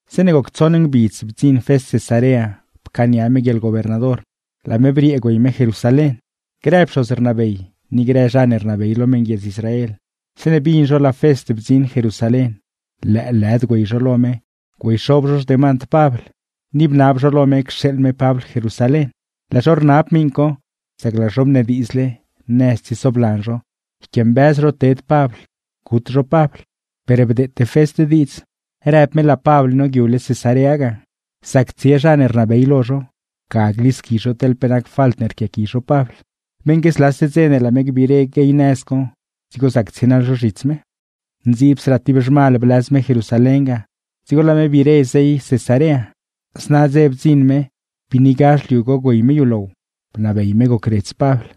Zeeṉe goc tsoṉ ngbidz bdziṉ Fest Cesarea pcaania me guieḻgobernador, laa me briee güey me Jerusalén. Grë zha pxoz non ni grë zha ne rnabey lo meṉguiedz Israel, zeeṉe bin zho laa Fest bdziṉ Jerusalén lëëlëd güey zho lo me güeyxob zho xdemand Pabl; ni bnab zho lo me cxeeḻ me Pabl Jerusalén. Laa zho rnab miṉ co sac laa zho bnediidzle, nëz tsiesoblan zho, yquiambëz zho ted Pabl gut zho Pabl. Per bdeete Fest diidz, rëb me laa Pabl nole ladzguiib ga, teḻ zha ne zrieelo tsie, ga glisqui zho teḻ pe nac falt ne rquiaqui zho Pabl; beṉque zlase dze laa me gbiire guey nëz co dzigo zac tsienaḻ zho zhits me. Ndziibsraa ti zhmal blëz me Jerusalén ga, dzigo laa me biire zey Cesarea. Zna dze bdziṉ me biinigazh liu co güey me yulow, bnabey me gocredz Pabl.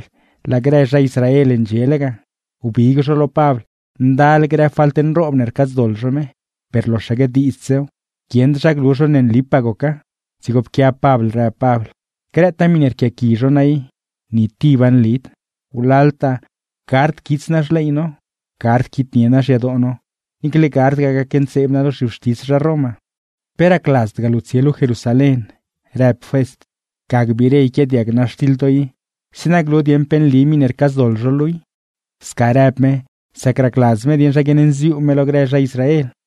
Laa grë zha Israel ndxiele ga, wbig zho lo Pabl ndal grë falt nroob ne rcaadzdoḻ zho me, per loxaque diidzsew, guieṉd zha glu zho ne nlipaa goca. Dzigo pquiab Pabl rëb Pabl: ―Grëtaa miṉe rquiaqui zho naa i, ni tiba nlid. Wlaltaa gard quits naa xley no, gard quitnie naa xyadoo no, niicle gardgaa gacntseeb naa lo zhiwxtis zha Roma. ―¿Pe racladzdgaa luu tsie luu Jerusalén? ―rëb Fest―. Ga gbiire yquiaadiag naa xtiḻ to i zeeṉa glu dieṉ chopaa rap doḻ. Sca rëb me, sac racladz me dieṉ zha guiaṉnziuu me lo grë zha Israel.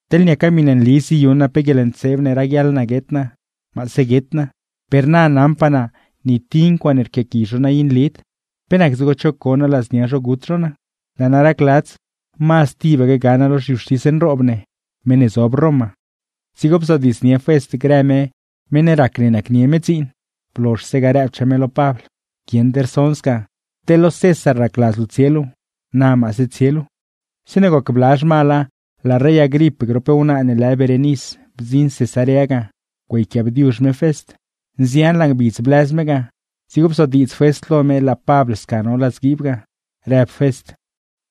Teḻ niaca miṉe nli ziyuṉ naa pe guieḻntseeb ne raguiaḻ naa guet naa, maase guet naa. Per na naṉpaa naa ni ti ncuaaṉe rquiaqui zho naa i nlid, ¿pe nac dzigo cho co naa ladznia zho gut zho naa? Laa naa racladz, mazd goḻneedz diidz tibaque ga naa lo zhiwxtis nroob ne, meṉ ne zob Roma. Dzigo bzodiidz Fest grë me meṉ rac ne nacnie me dziin; blozhse ga rëbchaa me lo Pabl: ―Guieṉd rson sca. ¡Teḻ lo César racladz luu tsie luu, na maase tsie luu! Zeeṉe goc bla zhmala, laa rey Agrip grop wnaa ne lë Berenis bdziṉ Cesarea ga güeyquiaabdiuzh me Fest. Nzianlaa ngbidz blëz me ga, dzigo bzodiidz Fest lo me laa Pabl sca no ladzguiib ga, rëb Fest: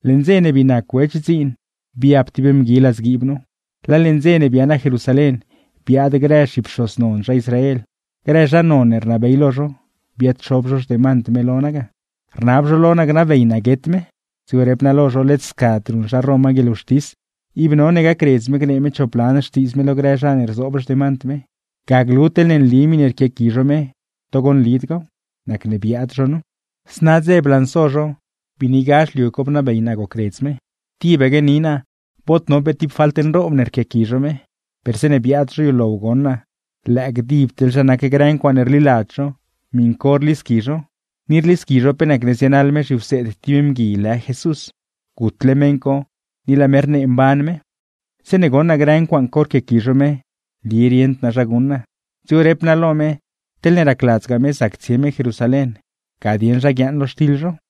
―Leṉ dze ne bii nac Wech dziin biab ti mgui ladzguiib nu, laa leṉ dze ne bia naa Jerusalén biaad grë zhipxoz non zha Israel, grë zha non ne rnabey lo zho, biaad-xob zho xdemand me lo naa ga, rnab zho lo naa gnabey naa guet me. Dzigo rep naa lo zho led scad ruṉ zha Roma guieḻwxtis, ib none gacredz me gnee me chop lan xtiidz me lo grë zha ne rzoob xdemand me, ga glu teḻne nli miṉe rquiaqui zho me togo nlidgaaw; nacne biaad zho nu. Zna dze blanso zho, biinigazh liu co bnabey naa gocredz me. Tibaque ni naa bod no pe ti falt nroob ne rquiaqui zho me, per zeeṉe biaad zho yulow goṉ naa lëë gdib teḻ zha nac grë ncuaaṉe rliladz zho miṉ co rlisqui zho, ni rlisqui zho pe nacne zienaḻ me zhiwseed ti mgui lë Jesús, gutle meṉ co ni laa me rnee mban me. ’Zeeṉe goṉ naa grë ncuaaṉ co rquiaqui zho me nli rieṉd naa zha guṉ naa, dzigo rep naa lo me, teḻne racladzgaa me zac tsie me Jerusalén ga dieṉ zha guiaaṉ lo xtiḻ zho.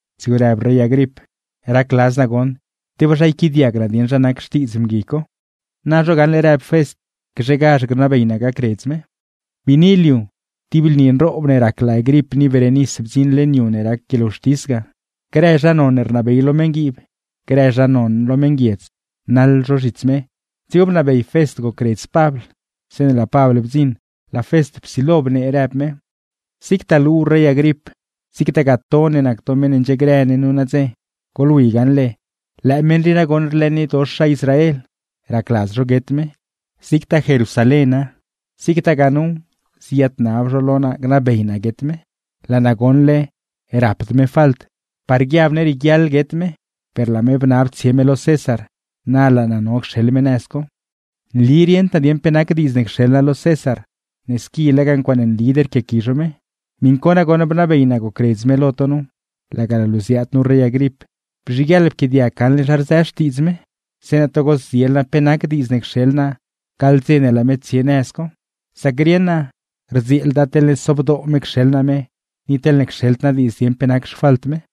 Dzigo rëb rey Agrip: ―Racladz naa goṉ tebaa zha yquiaadiag naa dieṉ zha nac xtiidz mgui co. ―Na zho gaṉle ―rëb Fest―, gzhegazh gnabey naa gacredz me. Biini liu, ti lni nroob ne rac laa Agrip ni Berenis bdziṉ leṉ yu ne rac guieḻwxtis ga, grë zha non ne rnabey lo meṉguiib, grë zha non lo meṉguiedz, naḻ zho zhits me. Dzigo bnabey Fest gocredz Pabl, zeeṉe laa Pabl bdziṉ laa Fest psilo bnee, rëb me: ―Niina ne laa luu ziaad nu rey Agrip, scagaa to ne nac to meṉ ne ndxiegrë ne nu nadze, goḻwi gaṉle lëë meṉ rii nagoṉ rlëëniedox zha Israel, racladz zho guet me; zigtaa Jerusaléna zigtagaa nuw ziyaadnab zho lo naa gnabey naa guet me. Saṉgue naa goṉle naa rapd me falt, par guiab ne rieguiaḻ guet me; per laa me bnab tsie me lo César, na laa naa no cxeḻ me nëz co. ’Nli rieṉd naa dieṉ pe nac diidz ne cxeḻ naa lo César, ne squi lega ncuaaṉe nlid rquiaqui zho me. Miṉ co nagoṉ bnabey naa gocredz me lo to nu, ni laga laa luu ziaadgaa nu rey Agrip, bzhiguieḻ pquiaadiag gaṉle zha rzë xtiidz me; zeeṉa togo zdziel naa pe nac diidz ne cxeḻ naa gaḻ dze ne laa me tsie nëz co. ¡Sac nonguieḻd ga guṉ naa teḻne sobdoo me cxeḻ naa me, ni teḻ cxeḻd naa diidz dieṉ pe nac xfalt me!